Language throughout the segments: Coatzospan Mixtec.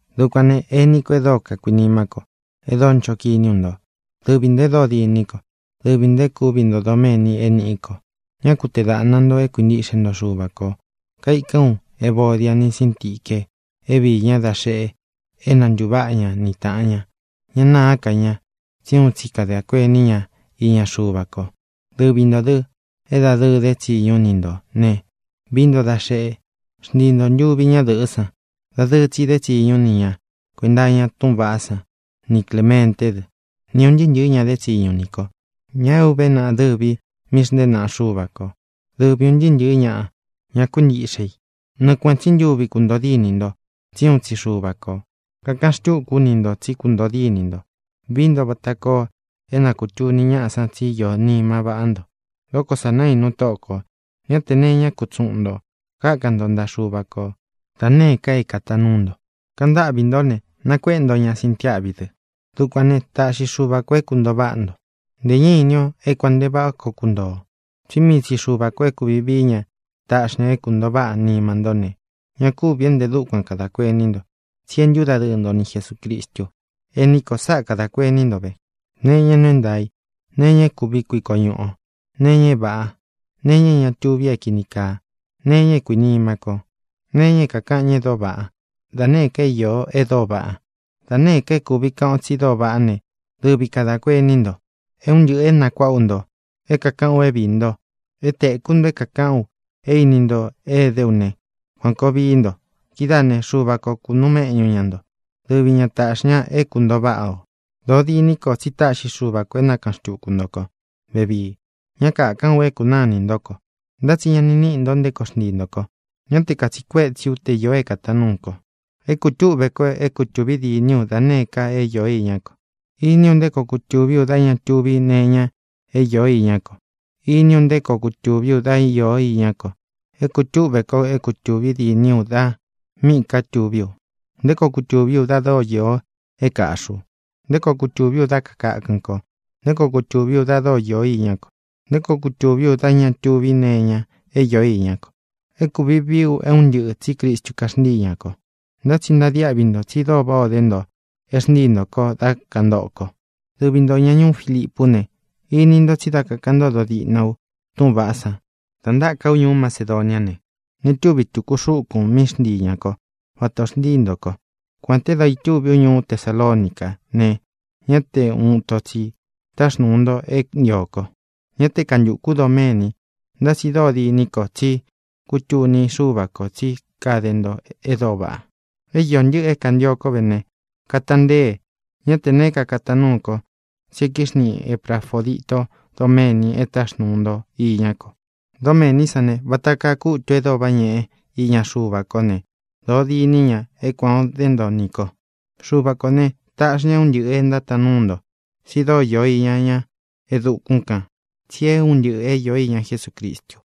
Dukuān né, ení ko e dóo kakuinimá ko, e dóo ncho kiní u nto, dɨvi ntō e dóo diní ko, dɨvi ntō e kúvi nto doméni é nīꞌí ko, ñá ku tee dāꞌna nto é kuintiꞌxe nto Xuva kō. Kaikán u Evodia ni Síntique é viī ñá da xeꞌe na ntūváꞌa ña ni tāꞌan ña. Ña nâá ka ña, tsí uun tsi kadā kuení ña iña Xuva ko. Dɨvi ntō dɨ́, é dādɨɨ dé tsiñu ú ni ntō ne, vií nto da xeꞌe, xntii nto ntuvi ñá dɨ̄ꞌɨ́ san. Dadɨɨ tsi dé tsiñu ú ni ña kuēnta iña túꞌūn vaꞌá san, ni Clēmenté dɨ, ni ūn ntɨɨ́ ntɨ̄ɨ́ ña dé tsiñu nī kó, ña é uve naꞌa dɨvī í míꞌī xntée naꞌa Xúva ko dɨ̄vi un ntɨɨ́ ntɨ̄ɨ́ ñaꞌa, ña kuíntiꞌxe i. Nɨɨ kuēꞌen tsí ntuvi kūntoo dínī nto, tsí uun tsi Xuva kō. Kakaꞌan xtúku ú ni ntō tsí kuntōo dínī nto. Vií nto vata koo é na kūtuni ñáꞌā tsí īó nima vaꞌá nto. Dókō sa naínú Tóꞌo kō. Ñá tē nee iñá kutsuꞌun ntō. Kákan nto ntaꞌa Xuva ko da nēé ka é kātaan núu nto. Kaꞌan ntáꞌvī ntó ne, nakuéꞌe nto ña sintiáꞌvi dɨ. Dukuān ne, táꞌxi Xuva kō é kūntoo váꞌa nto. Ntē ñá ini ō é kuān nte váꞌa koo kuntoo ō, tsí mii tsi Xuva kō é kūvi vií ña taꞌxi ña é kūntoo váꞌa nima ntó ne, ña kúvī é ntē dúkuan kadā kuení nto, tsí e ntúdadɨɨ nto ni Jesūcristu. Ení ko, sáꞌa kadā kuení nto ve: nee iña é nuu é ntaā í, nee iña é kuvi kuiko ñuꞌu ō, nee iña é vāꞌá, nee iña é ña tuvi é kīni kaa, nee iñá é kuīnima ko, nee iña é kākaꞌan ñáꞌa e dóo vaꞌá, da nēé ka é īó e dóo vaꞌa. Da nēé ka é kūvi kaꞌan o tsi dóo vaꞌá ne, dɨvi kadā kuení nto. É un ntɨꞌɨ̄ é nakuāꞌa ú nto, é kākaꞌán u é viī nto, é tēkú nto é kākaꞌán u, é īni nto é dé u ne, kuān koo vií nto. Kidáā né, Xuva ko kūnuu méꞌñu ña nto. Dɨvi ña tāꞌxi ña é kūntoo váꞌa ō. Dōo diní ko tsí táꞌxi Xuva kō é nakaꞌan xtūku nto kó vevii. Ñá kakāꞌán u é kunáa inī ntó ko, ntá tsi ña ni níꞌi nto nté koo xntii ntō ko. Ñá te kātsiꞌi kuétsi ú te īo é kātaan nuú ko. É kūtúꞌve ko é kutūvi dîní u da nēé ka é īó iñá ko. Iní u nté koo kutūví u dá ña tuvi nee iña é īó iñá ko. Iní u nté koo kutūví u dá īo iñá ko. É kūtúꞌve kó é kutūvi dîní u da míꞌī ká tuví u, nté koo kutūví u da dóo īo é kāꞌxí u, nté koo kutūví u dá kakākɨn ko, nté koo kutūví u da dóo īo iñá ko, nté koo kutūví u dá ña tuvi nee iña é īó iñá ko. É kūvi vií u é un ntɨꞌɨ̄, tsí Cristu kaxntíi ñā ko. Ntá tsi ntadiáꞌvi ntō, tsi dóo váꞌā o dé nto e xntíi ntō ko dá kantōꞌo ko. Dɨvi ntō ña ñuú Filipú ne, ini nto tsi dá kakāꞌan ntódo diꞌna u túꞌūn vaꞌá san, da ntáka ú ñuú Macedoniá ne, ña túvi tūku xúkūn míꞌi xntii ñā kó vata ō xntíi ntō ko. Kuān te dá itúvi ú ñuú Tesalonicá ne, ñá te ūun ito tsi táxnūu nto é ntio ko. Ñá te kantukū ú doméni, ntá tsi dóo diní ko tsí kutuni Xúva kō tsí kade nto e dóo vaꞌa. É īo ntɨ́ꞌɨ̄ é kāntio kó ve ne, katantée. Ñá tē neé ka kataan núū kó, tsi e kíxniꞌi Eprafōdito doméni e táxnūu nto iñá ko. Dómēní san ne, vata kaa kútū e dóo váꞌa ñēꞌe iña Xuva kó ne, dōo diní ña é kuān o dé nto nī ko. Xuva kō ne, taꞌxi ña é un ntɨꞌɨ̄ é ntátaan núu nto, tsi dóo īo iña ña e dukún kān. Tsi é un ntɨꞌɨ īó iña Jesúcristu.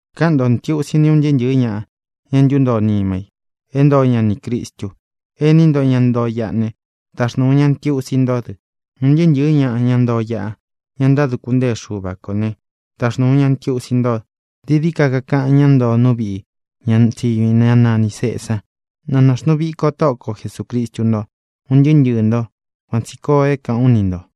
Káꞌan ntō ntiusi ní un ntɨɨ́ ntɨ̄ɨ́ ñaꞌa, ña e ntúntoo nima i é ntoo ña nī Cristu. Ení nto, ña ntoo iꞌa ne, taxnūu ñá ntiusi ntó dɨ. Un ntɨɨ́ ntɨ̄ɨ́ ñaꞌa, ña ntoo iꞌa, ña ntáduku ntée Xuva kō né, taxnūu ñá ntiusi nto. Dií dií ka kakaꞌan ñá ntoo nú viꞌi ña tsiñu i, ñá nanī Cesa. Na nāxnuu viko Tóꞌo ko Jesūcristu ntó, un ntɨɨ́ ntɨɨ̄ nto. Kuan tsī koo é kāꞌán u ni ntō.